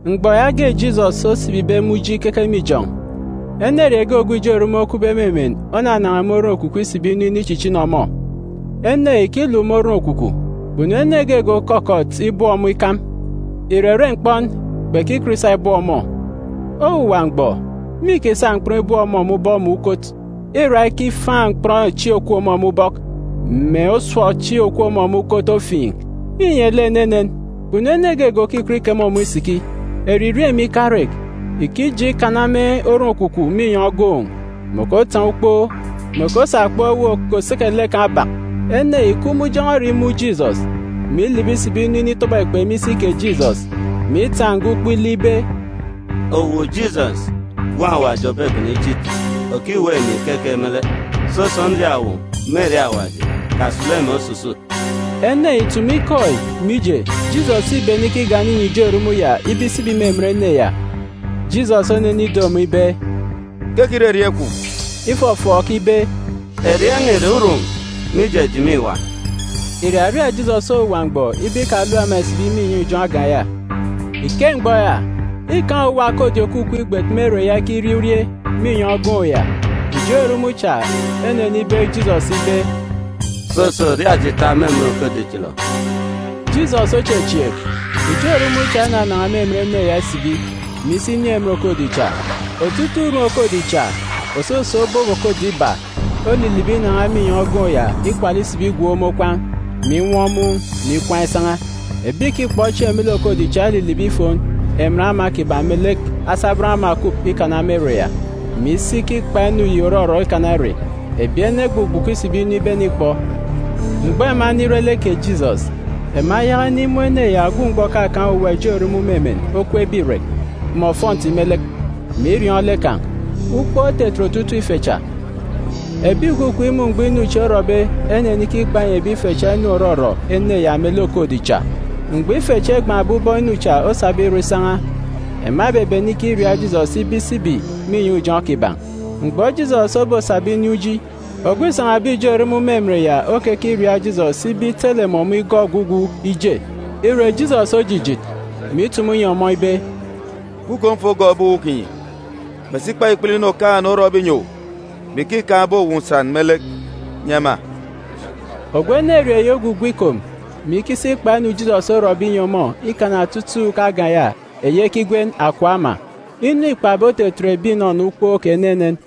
Mgbọ yaage Jisọs osibibe me uji ikeke me ijọn̄, enerieen̄ ge ogwu ijo erumun̄ okupbe me emen onanan̄a me oron-ekwukwu isibi inu inichichini ọmọ. Ene yi ìkiluk me oron-ekwukwu. Kpunu ene geege òkọkọt ibọp ọmọ ikam. Ìrere mkpọn, kpekikọt isa ibọp ọmọ. Owuwa mgbọ, mîkisa mkpọn ibọp ọmọ ubọk mè ukot, îra ikifaan̄ mkpọn echi òkup ọmọ me ubọk, mè osọp echi òkup ọmọ me ukot ofiin̄. Înye lek enenen. Kpunu ene geege òkikọt ikeme ọmọ isiki. Eririeen̄ mè ikarek, ìkije ikana me oron-ekwukwu mè inyọn̄ ogoon̄, mè òkotaan̄ ukpo, mè òkosa okpọkọ ewuuk òkoseke lek kan̄ obak. Ene yi îkup me ujọn̄ọ ere imun̄ Jisọs, mè ilibi isibi inu initọbọ ekpe me isi kè Jisọs, mè itaan̄ nga ukpo ile ibe, “Owu Jisọs, Gwun̄ Awaji Ogwu Òbebene Ichit, òkiweek emi keke me lek? Soso, nriaak owu, me erieen̄ Awaji, kasulu emi osusut.” Ene yi ìtumu ikọ yi, mije, Jisọs îbene ikigana inyi ijo erumun̄ ya ibe isibi me emen ene ya. Jisọs onenido ọmọ ibe, “Keke ire erieen̄ kwun̄?” Ifọfọọk ibe, “Erieen̄ n̄a ìre ‘Urum,’ mije, eji mîwa.” Irariaak Jisọs owuwa mgbọ ibe ikalap ema ìsibi me inyọn̄ ijọn̄ agan̄ ya. Me ike mgbọ ya, îkaan̄ owuwa okodi òkukup igbet me ere ya ikirie urie me inyọn̄ ogoon̄ ya. Ijo erumun̄ cha enenibeek Jisọs ibe, “Soso, ria eji tap me emen okodi chilọ.” Jisọs ochechieek. Ijo erumun̄ cha enanan̄a me emen ene ya isibi, mè isi inin̄ emen okodi cha. Otutuuk urum okodi cha, òsoso obop okodi iba, olilibi inan̄a me inyọn̄ ogoon̄ ya ikwala isibi igwook me okwaan̄, mè inwọ mun̄, mè ikwaan̄ isan̄a. Ebi ìkikpọ chieen̄ me lek okodi cha elilibi ifon emen ama kiban̄ melek asabọn ama òkukup ikana me ere ya, mè isi ikikpa inu yi òrọrọ ikana ere. Ebi ene egbugbuku isibi inu ibenikpọ. Mgbọ ema enire lek kè Jisọs, ema eyaka inimun̄ ene ya ogwu mgbọ òkakaan̄ urum ijo erumun̄ me emen okweekbe irek, mè ofọnti me lek, mè iriọọn̄ lek kan̄. Ukpook otetet otutuuk ife cha. Ebi ìkukup imun̄ mgbọ inu chi orọbe enenikikpa inyi ebi ife cha inu òrọrọ ene ya melek okodi cha. Mgbọ ife chi egban̄be ubọk inu cha osabe irọ isan̄a, ema ebebene ikiriaak Jisọs ibe isibi me inyọn̄ ijọn̄ kiban̄. Mgbọ Jisọs obosaba inin̄ uji, ogwu îrieen̄be ijo erumun̄ isibi me emen ya okekiriaak Jisọs ibe itele mè ọmọ igọọk ogwugwu ije. Ire, Jisọs ojijit, mè itumu inyi ọmọ ibe, “Gwu kom fo gọọk ebi uwu kinyi, mè si kpa ikpele inu Okaan̄-ene orọbe inyi owu, mè ike îkaan̄be owu nsan me lek nyi ema.” Ogwu enerieen̄ yi ogwugwu ikom, mè isi ikikpa inu Jisọs orọbe inyi ọmọ ikana otutuuk agan̄ ya eyi ekigwen “Akọp Ama.” Inu îkpabe otetet ebi ìnọnọ ukpook enenen.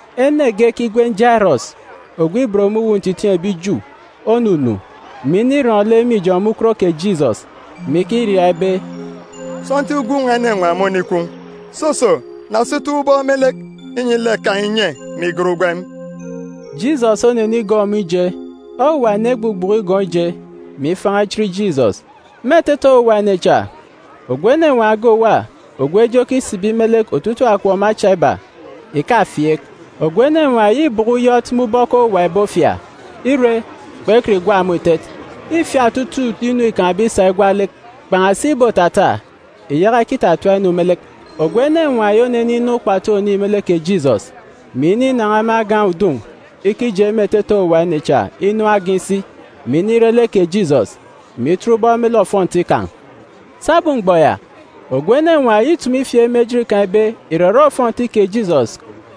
Ene ge ekigwen Jairọs, ogwu ibot me uwu ntitiin̄ ebi Ju, onunu, mè inirọn̄ lek me ijọn̄ me ukot kè Jisọs, mè ikiriaak ibe, “Sọntiik gwun̄ n̄a enenwaan̄ mônikwu. Soso, na si toon̄ ubọk me lek, inyi lek kan̄ inye, mè igat ugwem.” Jisọs onenigọọk ọmọ ije. Owuwa ene egbugbuku igọọk ije, mè ifan̄a ichit Jisọs. Me etete owuwa ene cha, ogwu enenwaan̄ ge òwa ogwu eje okisibi me lek otutuuk akọp mè acha iba, ìkafieek. Ogwu enenwaan̄ yi îbọkọ uyọt me ubọk owuwa ebi ofia, ire, kpekọt igwa ọmọ itet. Îfiat otutuuk inu îkaan̄be isa igwa lek, kpan̄asi îbotata, ìyaka ikitatap inu me lek. Ogwu enenwaan̄ yi oneninọ ukpatu ònin̄ me lek kè Jisọs, mè ininan̄a me agan̄ udun̄ ikije me etete owuwa ene cha inu agan̄ isi, mè inire lek kè Jisọs, mè itet ubọk me lek ofọnti kan̄. Sabum mgbọ ya, ogwu enenwaan̄ yi îtumu ifieek me ejit kan̄ ibe ìrere ofọnti kè Jisọs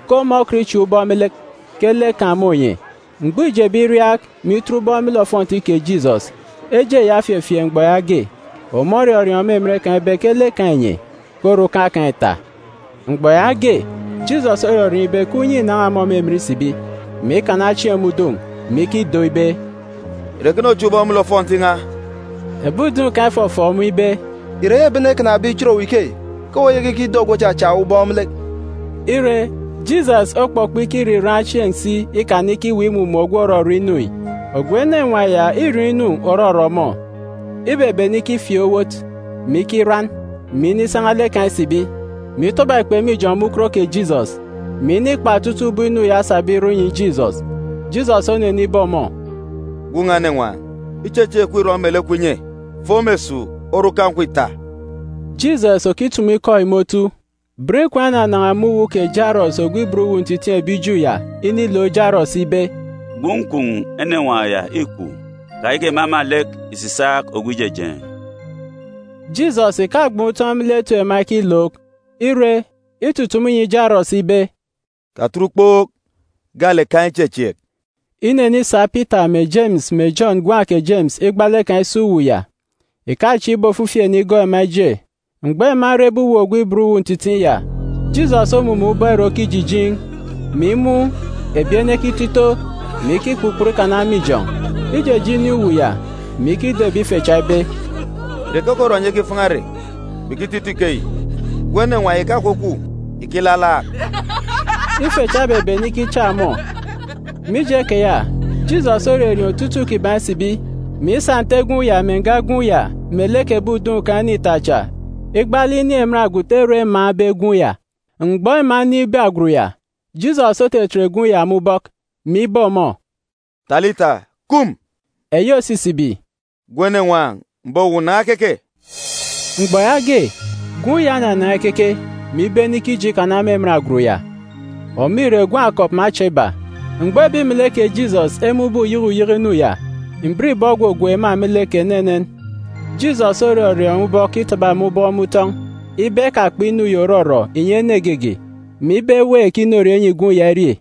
ke ọmọ okọt ichak ubọk me lek, ke lek kan̄ mônye. Mgbọ îjebe iriaak, mè itet ubọk me lek ofọnti kè Jisọs, eje ya ofefieek mgbọ yaage. Ọmọ orọriọọn̄ me emen kan̄ ibe ke lek kan̄ înye; ke orukan̄ kan̄ îta. Mgbọ yaage, Jisọs orọriọọn̄ ibe ke unye înan̄a ọmọ me emen isibi, mè ikana chieen̄ me udun̄, mè ikido ibe, “Ìre ekene ochak ubọk me lek ofọnti n̄a?” Ebi udun̄ kan̄ efọfọọk ọmọ ibe, “Ìre eyi ebi ene ekanabe ichit owu ikeyi ke owu oyaka ikido ogwu òchachak owu ubọk me lek?” Ire, Jisọs okpọkpọ ikiriraan̄ chieen̄ si ikana ikiweek imumun̄ ogwu òrọrọ inu yi. Ogwu enenwaan̄ ya îriọọn̄ inu òrọrọ ọmọ. Ibebene ikifieek owot, mè ikiran, mè inisan̄a lek kan̄ isibi, mè itọbọ ekpe me ijọn̄ me ukot kè Jisọs, mè inikpa otutuuk ubọk inu ya osabe irọ inyi Jisọs. Jisọs onenibe ọmọ, “Gwun̄ n̄a enenwaan̄, ichechieek kwun̄ îrọ mè lek kwun̄ inye. Fo me esuuk. Orukan̄ kwun̄ ita.” Jisọs òkitumu ikọ yi me otu, bọn ikwaan̄ enanan̄a me uwu kè Jairọs ogwu ibot uwu ntitiin̄ ebi Ju ya inilook Jairọs ibe, “Gwun̄ kwun̄ enenwaan̄ ya îkwu. Kayaka ìmama lek ìsisaak ogwu ijejeen̄.” Jisọs ìkagban̄ utọn̄ me lek etip ema ekilook, ire, itutumu inyi Jairọs ibe, “Katet ukpook, gaalek kaan̄ ichechieek!” Inenisa Pita mè Jemis mè Jọn ngwan̄ kè Jemis igbaalek kan̄ isi uwu ya, ìkachieek ibe ofifi ene igọọk ema ije. Mgbọ ema erebe uwu ogwu ibot uwu ntitiin̄ ya, Jisọs omumun̄ ubọk ere okijijiin̄, mè imun̄ ebi ene ekito ito, mè ikikpukpọt ikana me ijọn̄. Ijeje inin̄ uwu ya, mè ikido ebi ife cha ibe, “Ìre keke orọ enyi ekifan̄a ere, mè ikito ito ikeyi? Gwun̄ enenwaan̄ yi ìkakwukwu, ìkilalaak.” Ife cha ebebene ikichak ọmọ. Mije keya, Jisọs orerieen̄ otutuuk kiban̄ isibi, mè isa nte gwun̄ ya mè nga gwun̄ ya melek ebi udun̄ kan̄ ene ita cha igbaalek inin̄ emen agwut ere emaan̄be gwun̄ ya. Mgbọ ema enin̄be agwut ya, Jisọs otetet gwun̄ ya me ubọk, mè ibe ọmọ, “Talita, kum!” eyi òsisibi, “Gwun̄ enenwaan̄, m̀be owu, nan̄a keke!” Mgbọ yaage, gwun̄ ya onanan̄a ikeke, mè ibene ikije ikana me emen agwut ya. (Ọmọ ìre gwun̄ akọp mè acha iba). Mgbọ ebi melek kè Jisọs emun̄be uyeke uyeke inu ya, mbiribọ ogwogwook ema me lek enenen. Jisọs orọriọọn̄ ubọk itaba ema ubọk me utọn̄ ibe ekakpa inu yi òrọrọ ìnyi ene geege, mè ibe eweek inorie enyi gwun̄ ya irie.